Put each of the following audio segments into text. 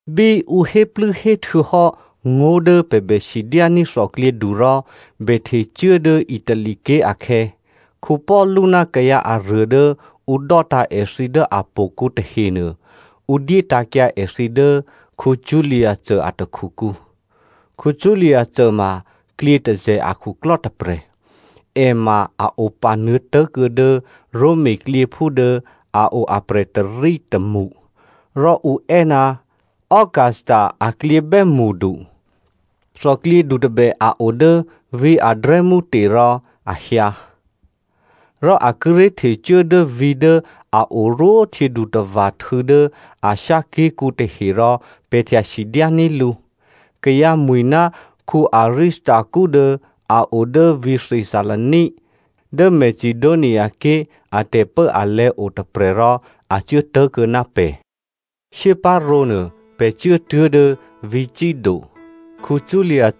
Bí ǔ héplû́héhtuô̌ hò́ ngó̤ dố pè̤ bè sidyání̤ thòklyědu rò bè htecuố dố Italy ké̤ akhè̌, Paulu ná kayǎ aruô dố ǔ dò́tǎ̤ èthǐ dố htò̌kǔ tahenuô, ǔ dyétǎ̤kyǎ èthǐ dố Julius a takhukǔ. Julius ma klyětôzè̤ akhuklò́ tôprè̤. È ma a o panuô̌tố̤ kuô̌ dố Roma klyěphú dố a o aprè̤ tôrí tômṳ, rò ǔ è́ ná “Augusta aklyě bè́mṳdu.” Thòklyědu tôbè a o dố vǐ̤ Adramytium rò a hyǎ. Rò a kíré̤ htecuố dố vǐ̤ dố a orwó htyědutava̤htû̌ dố Asia ké̤kǔ tahe rò pè̤ htya sidyání̤ lǔ. Kayǎ mwi̤ ná Aristarko dố a o dố vǐ̤ Thessalonia, dố Macedoniaké̤ a tè̤pốalè̤̌ otôprè̤ rò a cuố tố̤kuô̌ ná pè̤. Shyéparǒ nuô, pè̤ cuốtuố̤ dố vǐ̤ Sido. Julius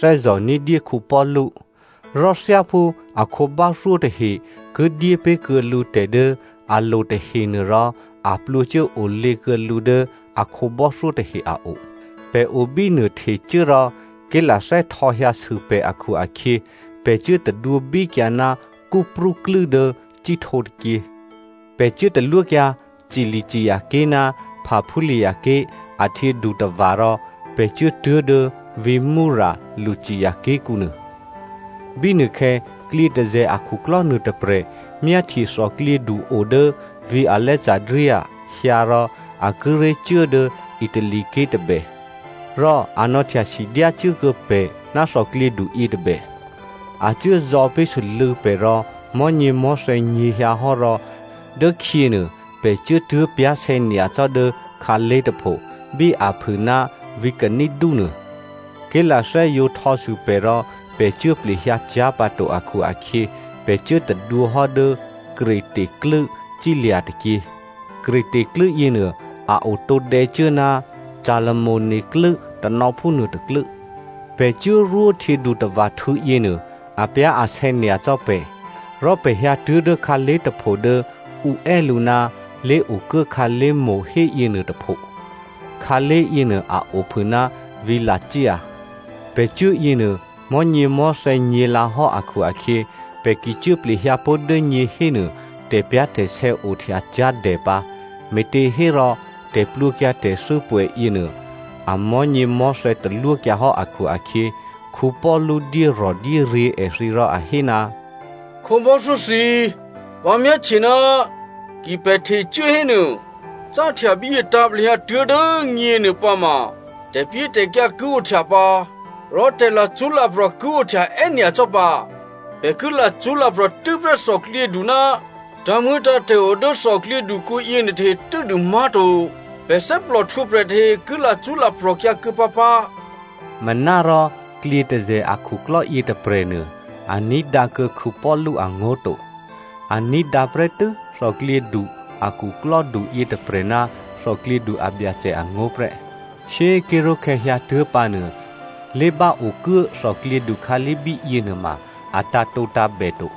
thè́zò̤ ní̤dyé Paulu. Rò thyáphú a khǒbò́thyó tahe ki dyépé̤ kuô̌ lǔ tè̤ dố a lo tahenuô rò a plwǒcuốolě kuô̌ lǔ dố a khǒbò́thyó tahe a o. Pè̤ obínuô htecuố rò ké̤lathè́ htò̌hyǎsû pè̤ akhu-akhyě, pè̤ cuố tadwǒbíkyǎ ná Cyprú klû́ dố cíhtǒ tôkyě. Pè̤ cuố talwókyǎ Cilicia ké̤ ná Pamphylia ké̤ a htyědutava̤ rò pè̤ cuốtuố̤ dố vǐ̤ Myra, Lycia ké̤kǔnuô. Bínuôkhè̌ klyětôzè̤ akhuklò́ nuôtôprè̤ myáhtye thòklyědu o dố vǐ̤ Alexandria hyǎ rò a kíré̤ cuố dố Italy ké̤ tôbè, rò a nò̌htyasidyá cuốkuô̌ pè̤ ná thòklyědu yětôbè. A cuốzò̌ pé̤ sû́lû̌ pè̤ rò mò̤́nyěmò̤́thè̌ nyě̤hyǎhò́ rò dốkhyěnuô pè̤ cuốtuố̤ pyá̤sè̌nyacò́ dố khǎlé̤ tôpho, bí aphû ná vǐ̤ Cida nuô. Ké̤lathè́ yǒ htò̌sû pè̤ rò pè̤ cuố plehyǎ cyá̤pǎto akhu-akhyě, pè̤ cuố tadwǒhò́ dố Crete klû́ cílya̤ tôkyě. Crete klû́ yěnuô a o tǒdè̌cuố ná Salmone klû́ tanò̌phú nuôtôklû́. Pè̤ cuốrwó htyědutava̤htû̌ yěnuô apyá̤asè̌ nyacò́ pè̤. Rò pè̤ hyǎtuố̤ dố khǎlé̤ tôpho dố ǔ è́ lǔ ná Lé̤okuố khǎlé̤mo̤ héyěnuô tôpho. Khǎlé̤ yěnuô a ophû ná vǐ̤ Lasea. Pè̤ cuố yěnuô, mò̤́nyěmò̤́thè̌ nyě̤lǎhò́ akhu-akhyě pè̤ ki cuố plehyǎ pó̤ dố nyě hénuô tè̤pyá̤tè̤sè̌ ohtya cyá̤dè pǎ, me̤těhérò, tè̤plwǒkyǎ tè̤thû́ pwè̌yěnuô amò̤́nyěmò̤́thè̌ talwókyǎhò́ akhu-akhyě Paulu dyérò̤dyéryě̤ èthǐ rò a hé, “Khǒbò́thyó thǐ꤮, vǎ myáhtye ná ki pè̤ htecuố hénuô, cáhtya bíyě tǎ̤plehyǎ tuố̤ dố nyě nuôpǎma tè̤pyétè̤kyǎ ki ohtya pǎ, rò tè̤lacṳ́laprò̤ ki ohtya è́nyacò́ pǎ. Pè̤ ki lacṳ́laprò̤ tû́prè́ thòklyědu ná tǎ̤muô̌tǎ̤tè̤ o dố thòklyědukǔ yěnuôtahe tû́dû má̤to. Pè̤ thè́plò htwǒprè̤ tahe ki lacṳ́laprò̤kyǎ kuô̌ pǎpǎ.” Manárò klyětôzè̤ akhuklò́ yětôprè̤nuô a ní̤dǎkuô̌ Paulu angó̤ to. A ní̤dǎ prè́tû́ thòklyědu a khuklò́du yětôprè̤ ná thòklyědu abyacè angó̤ prè́. Shyé꤮ ké̤ró̤khè̌ hyǎtuố̤pǎnuô, lé̤báokuố thòklyědu khǎlé̤ bíyě nuôma a tǎ̤tǒtǎ̤bè to.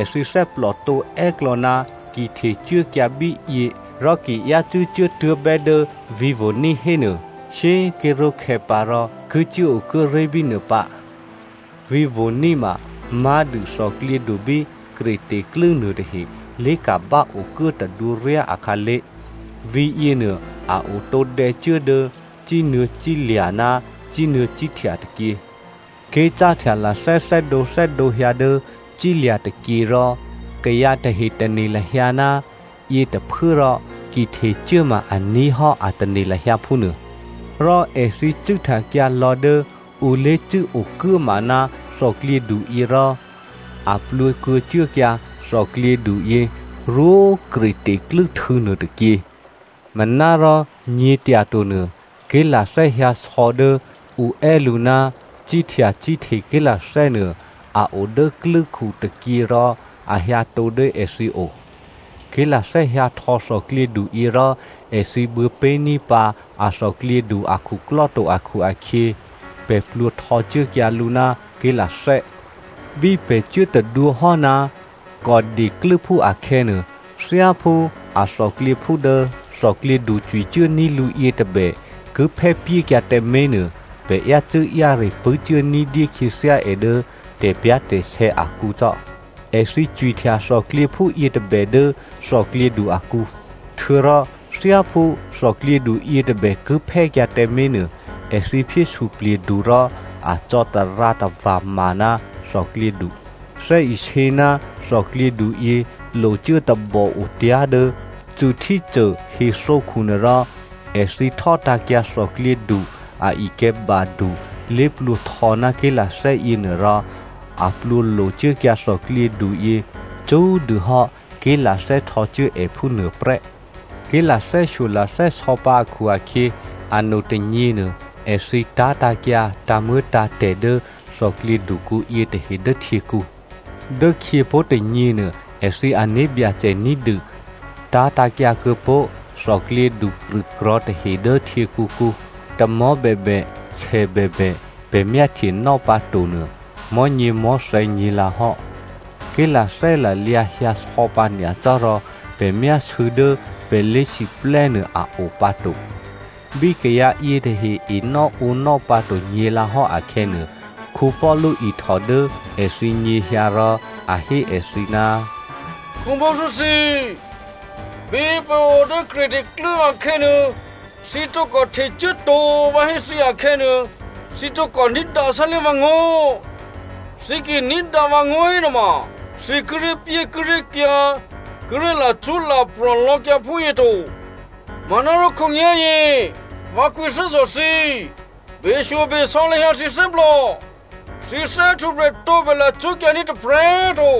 Èthǐ thè́plòtǒ è́klò̌ ná ki htecuốkyǎ bíyě, rò ki yácû́ cuốtuố̤bè́ dố vǐ̤ Phoeni hénuô, shyé꤮ ké̤ró̤khè̌ pǎrò ki cuốokuốré̤ bínuô pǎ. Vǐ̤ Phoeni ma má̤dû thòklyědu bí Crete klû́ nuôtahe lé̤ka̤báokuố tadwǒryá akhǎlé̤. Vǐ̤yěnuô, a o tǒdè̌cuố dố cínuô̌ cílya̤ ná cínuô̌ cíhtya tôkyě. Ké̤ cáhtya lathè́ thè́dǒthè́dǒ hyǎ dố cílya̤ tôkyě rò kayǎ tahe tane̤ lahyǎ ná yětôphuốrò, ki htecuố ma aní̤ hò́ a tane̤ lahyǎ phúnuô, rò èthǐ cû́htyakyǎ lò̤́ dố ǔ lé̤cû́ okuốma ná thòklyěduyě rò a plwǒkuô̌cuốkyǎ thòklyěduyě rwó Crete klû́htû̌ nuôtôkyě. Manárò nyě̤tyatonuô, ké̤lathè́ hyǎsò̌ dố ǔ è́ lǔ ná “Cíhtya cíhte ké̤lathè́” nuô a o dố klû́khu tôkyě rò a hyǎtǒ dố èthǐ o. Ké̤lathè́ hyǎhtò̌ thòklyěduyě rò èthǐ buô̌pé̤ ní̤dyé pǎ a thòklyědu akhuklò́ to akhu-akhyě, pè̤ plwǒ htò̌cuốkyǎ lǔ ná ké̤lathè́. Bí pè̤ cuốtadwǒhò́ ná Cauda klû́phú akhè̌nuô, thyáphú a thòklyěphú dố thòklyědu cwicuốní̤ lǔ yětôbè ki phè́pyékyǎ tǎmé̤ nuô, pè̤ yácû́-yáre pṳ̂́cuố ní̤dyé khyěthyá è dố tè̤pyá̤tè̤sè̌ akǔcò́. Èthǐ cwihtya thòklyěphú yětôbè dố thòklyědu akǔ, htuô̌rò thyáphú thòklyědu yětôbè ki phè́kyǎ tǎmé̤nuô, èthǐ phyé suplye̤du rò a cò̌tarǎ tava̤ma ná thòklyědu. Thè́isě ná thòklyěduyě locuố tabò otyá̤ dố Syrti hethǒkhu nuôrò, èthǐ htò́tǎ̤kyǎ thòklyědu a ikè̤̌badu lé̤plwǒhtò̌ ná ké̤lathè́ yěnuô rò a plwǒ locuốkyǎ thòklyědu yě, cṳ́꤮ dûhò́ ké̤lathè́ htò̌cuố è phúnuô prè́. Ké̤lathè́shyo lathè́sò̌ pǎ akhu-akhyě, ano tônyěnuô èthǐ tá̤tǎ̤kyǎ tǎ̤muô̌tǎ̤tè̤ dố thòklyědukǔ yětahe dố htyěkǔ. Dốkhyěpó̤ tônyěnuô, èthǐ ané̤byacè ní̤dû tá̤tǎ̤kyǎ kuô̌pó̤ thòklyědu krṳ̂krò̤̌ tahe dố htyěkǔkǔ. Tamò̤́ bèbè, sè bèbè, pè̤ myáhtyenò́ pǎ to nuô, mò̤́nyěmò̤́thè̌ nyě̤lǎhò́, ké̤lathè́ lalyǎ hyǎsò̌pǎ nyacò́ rò pè̤ myásû̌ dố pè̤ lé̤siplè́ nuô a o pǎto. Bí kayǎ yětahe enò́ǒnò́ pǎto nyě̤lǎhò́ akhè̌nuô, Paulu ihtò dố èthǐ nyěhyǎ rò a hé èthǐ, “Khǒbò́thyó thǐ꤮ bí pè̤ o dố Crete klû́ akhè̌nuô, thǐ tǒkò htecuố to vǎ hé thǐ akhè̌nuô, thǐ tǒkò ní̤dǎ sálé̤ vǎngó̤. Thǐ ki ní̤dǎ vǎngó̤ hénuôma, thǐ kíré̤pyékíré̤kyǎ, kíré̤ lacṳ́laprò̤ lò̌kyǎ phúyě to. Manárò khǒnyá̤yě vǎ kwǐthè́zò̤ thǐ, beshyobesò̌ lahyǎ thǐ thè́plò, thǐ thè́htwǒprè̤ tǒbè lacṳ́kyǎní̤ tôprè̤꤮ to.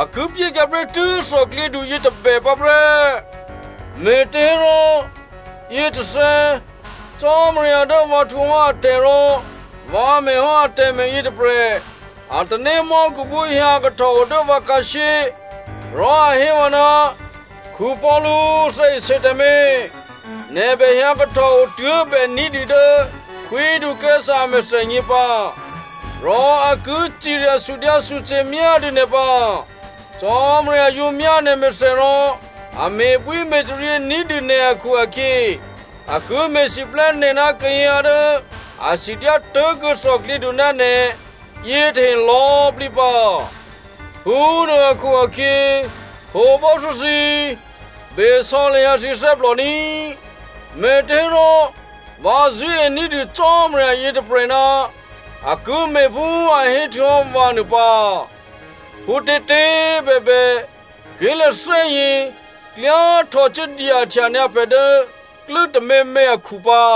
A ki pyékyǎ prè́tû́ thòklyědu yětôbè pǎ prè́. Me̤těhérò, yětôthè̌, Cò́marya dố vǎ htwǒhò́ atè̤ rò vǎ me̤hò́ atè̤me̤ yětôprè̤ a tanémò́khuphú hyǎ kahtòo dố vǎ khǎshyé, rò a hé vǎ, ‘Paulu꤮, thè́isě tǎmé̤. Nè̤ bè hyǎ kahtòo tuố̤bè́ ní̤dû dố Khwídu Caesare a mèthènyě pǎ, rò a ki cirya sudyǎsuce̤myá dû nè̤ pǎ. Cò́marya yǒ myá nè̤mèthè rò a me̤bwíme̤taryě ní̤dû nè̤ akhu-akhyě, a ki me̤siplè́ nè̤ ná kayǎ dố a sidyá tố̤kuô̌ thòklyědu ná nè̤ yětahe lò̌꤮ plǐ pǎ.’ Phúnuô akhu-akhyě, khǒbò́thyó thǐ꤮, besò̌ lahyǎ thǐ thè́plò ní꤮, me̤těhérò vǎ zṳ̂́ení̤dû Cò́marya yětôprè̤ ná a ki me̤phú a héhtuô̌hò́ vǎ nuô pǎ. Phútětě꤮ bèbè, ké̤lathè́yě klyá htò̌cuố dyahtya nyǎ pè̤ dố klû́ tôměmě akhu pǎ.”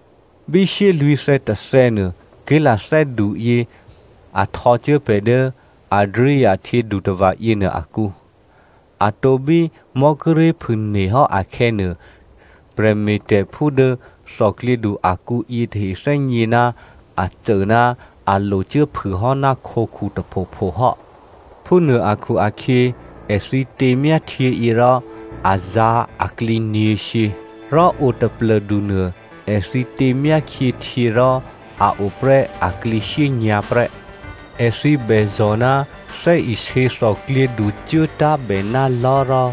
Bí shyélwǐ̤thè̌ tôthè̌nuô, ké̤lathè́duyě a htò̌cuố pè̤ dố Adria htyědutava̤ yěnuô akǔ. Atǒ bí mò̤́ kíré̤ phûne̤hò́ akhè̌nuô, prè̤me̤tè̤phú dố thòklyědu akǔ yětahe thè́gně ná a cô ná a locuốphûhò́ ná khǒkhu tôphopho hò́. Phúnuô akhu-akhyě, èthǐ těmyá htyěyě rò a zǎ̤ aklǐ nyě̤shyě, rò o taplô̤du nuô èthǐ těmyákhyě htyě rò a oprè́ aklǐ shyényǎ̤ prè́. Èthǐ bèzò̤ ná thè́isě thòklyědu cuốtá̤bè ná lò̤́ rò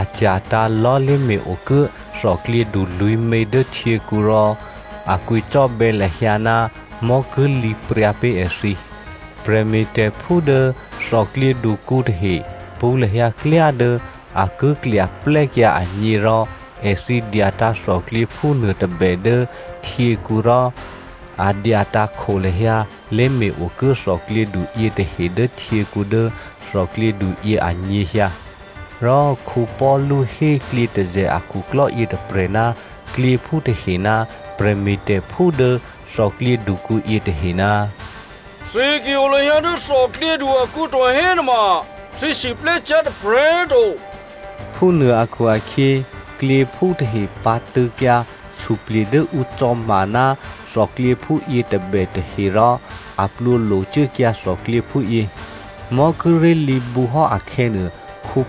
a cya̤tǎ̤ lò̤́ lé̤me̤-okuố thòklyědu lwǐ̤mě dố htyěkǔ rò a kwǐcò́bè̌ lahyǎ ná mò̤́ ki lǐ pryǎ pé̤ èthǐ. Prè̤me̤tè̤phú dố thòklyědukǔ tahe pṳ̌ lahyǎ klyá dố a ki klyaplè́kyǎ agně rò èthǐ dyatǎ̤ thòklyěphú nuôtôbè dố htyěkǔ rò a dyatǎ̤ kho lahyǎ lé̤me̤-okuố thòklyědu yětahe dố htyěkǔ dố thòklyědu yě anyěhyǎ. Rò Paulu hé klyětôzè̤ akhuklò́ yětôprè̤ ná klyěphú tahe ná prè̤me̤tè̤phú dố thòklyědukǔ yětahe, “Thǐ ki o lahyǎ dố thòklyědu akǔ to hénuôma thǐ siplè́cyá̤ tôprè̤꤮ to.” Phúnuô akhu-akhyě, klyěphú tahe pǎ̤tṳ̂̌kyǎ suplye̤ dố ǔ cò̌ma ná thòklyěphú yětôbè tahe rò a plwǒ locuốkyǎ thòklyěphú yě. Mò̤́ kíré̤ lǐbǔhò́ akhè̌nuô,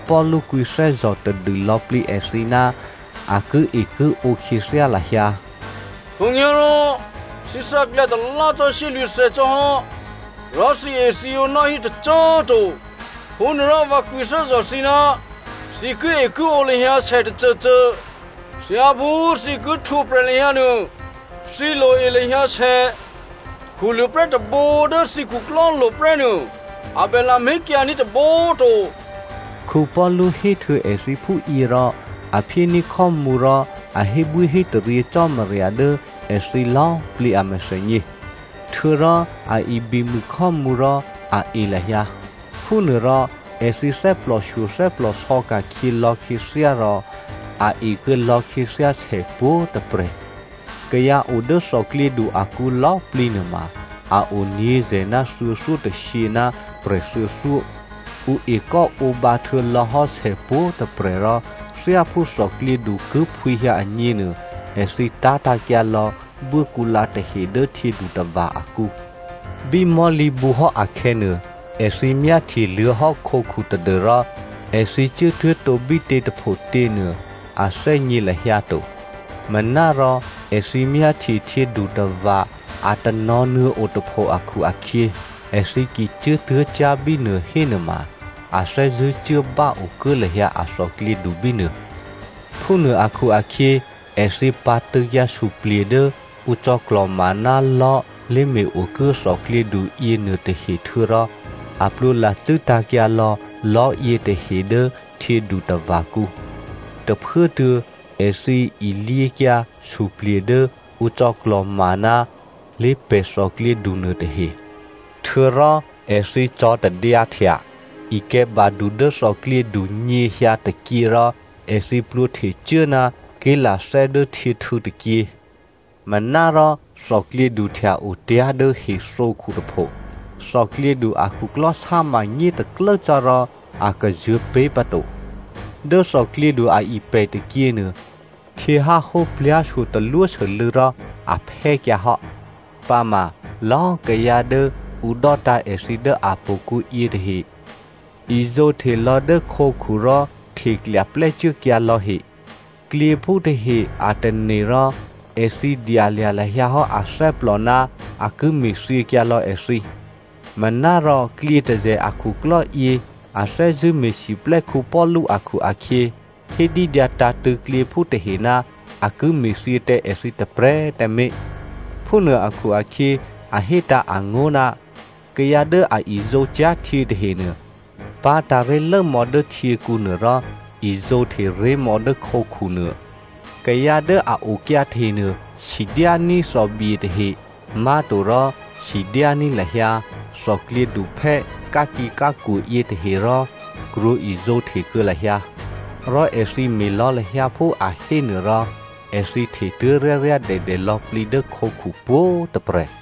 Paulu kwǐthè́zò̤ tadû lò̌plǐ èthǐ ná a kie kiǒ khyěthyá lahyǎ. “Khǒnyá̤rò thǐ thǎklyǎ talá cò́ shyélwǐ̤thè̌ cò́hò́, rò thǐethǐǒ nò́hí tôcô꤮ to. Phúnuôrò, vǎ kwǐthè́zò̤ thǐ ná thǐ kiekiǒ lahyǎ sètôcôcô. Thyáphú thǐ ki htwǒprè̤ lahyǎ nuô, thǐ loe lahyǎ sè. Khuluô̤ prè́ tôbǒ dố thǐ khuklò́lo̤ prè́nuô a bè lamé̤kyǎní̤ tôbǒ꤮ to.” Paulu héhtuô̌ èthǐ phúyě rò, a phyéní̤ khò́mǔ rò a hébwíhétaryě Cò́marya dố èthǐ lò̌꤮ plǐ a mèthènyě. Htuô̌rò a ibimû khò́mǔ rò a e lahyǎ. Phúnuôrò èthǐ thè́plòshyo thè́plòsò̌ ka̤khyě lò̌khyěthyá rò a ekuô̌ lò̌khyěthyá sè pwǒ̤꤮ tôprè̤. Kayǎ o dố thòklyědu akǔ lò̌꤮ plǐ nuôma a o nyě̤zè̤ ná thuô̌thyótôshyě ná prè̤ thuô̌thyó. Ǔ ekò́ǒbǎ htuô̌lò̌hò́ sè pwǒ̤꤮ tôprè̤ rò thyáphú thòklyědu ki phwǐhyǎ agně nuô, èthǐ tá̤tǎ̤kyǎlò̌ buốkǔlǎ tahe dố htyědutava̤ akǔ. Bí mò̤́lǐbǔhò́ akhè̌nuô, èthǐ myáhtye luô̌hò́ khǒkhu tadû́rò èthǐ cuốtuố̤tǒ bítě tôphotě nuô a thè́gně lahyǎ to. Manárò èthǐ myáhtye htyědutava̤ a tanò̤̌nuô̌ otôpho akhu-akhyě, èthǐ ki cuốtuố̤cyá̤ bínuô hénuôma, a thè́zṳ̂́cuố báokuố lahyǎ a thòklyědu bínuô. Phúnuô akhu-akhyě èthǐ pǎ̤tṳ̂̌kyǎ suplye̤ dố ǔ cò̌klò̤ma ná lò̤́ lé̤me̤-okuố thòklyědu yěnuôtahe htuô̌rò a plwǒ lacû́ tǎ̤kyǎ lò̌ lò̤́yětahe dố htyědutava̤kǔ. Tôphuốtuô̌ èthǐ ilyěkyǎ suplye̤ dố ǔ cò̌klò̤ma ná lé̤pè̤ thòklyědu nuôtahe. Htuô̌rò èthǐ cò̌tadyǎhtya ikè̤̌badu dố thòklyědu nyěhyǎ tôkyě rò èthǐ plwǒhtò̌cuố ná ké̤lathè́ dố htyěhtû̌ tôkyě. Manárò thòklyědu htya-otyá̤ dố hethǒkhu tôpho. Thòklyědu akhuklò́ sáma nyétaklố cò́ rò a kazuô̤̌ pé̤pǎto. Dố thòklyědu aipè̤ tôkyěnuô, htyěháhó plyá̤shyo talwósû́lû̌ rò a phè́kyǎhò́. Pǎma lò̌꤮ kayǎ dố ǔ dò́tǎ̤ èthǐ dố htò̌kǔ yětahe izǒhte lò̌ dố khǒkhu rò hteklya plè́cuốkyǎ lò̌ he, klyěphú tahe a tane̤ rò, èthǐ dyalya̤ lahyǎ hò́ athè́plò ná a ki me̤thyěkyǎ lò̌ èthǐ. Manárò klyětôzè̤ a khuklò́yě a thè́zṳ̂́ me̤siplè́ Paulu akhu-akhyě, hé dídyǎtǎ̤tṳ̂̌ klyěphú tahe ná a ki me̤thyě tǎ èthǐ tôprè̤꤮ tǎmé̤. Phúnuô akhu-akhyě a hétǎ̤ angó̤ ná kayǎ dố a izǒcyá̤ htyě tahenuô pá̤tǎ̤ ré̤lốmò̌ dố htyěkǔnuô rò izǒhteré̤mò̌ dố khǒkhu nuô. Kayǎ dố a okyǎ tahenuô, sidyání̤ thòbye tahe, má̤torò sidyání̤ lahyǎ thòklyědu phè́ khakǐkhǎkwo yětahe rò krwǒ izǒhte kuô̌ lahyǎ. Rò èthǐ me̤ lò̌ lahyǎ phú a hé nuôrò èthǐ htetuố̤ ryáryádèdè lò̌plǐ dố khǒkhu pwǒ̤꤮ tôprè̤.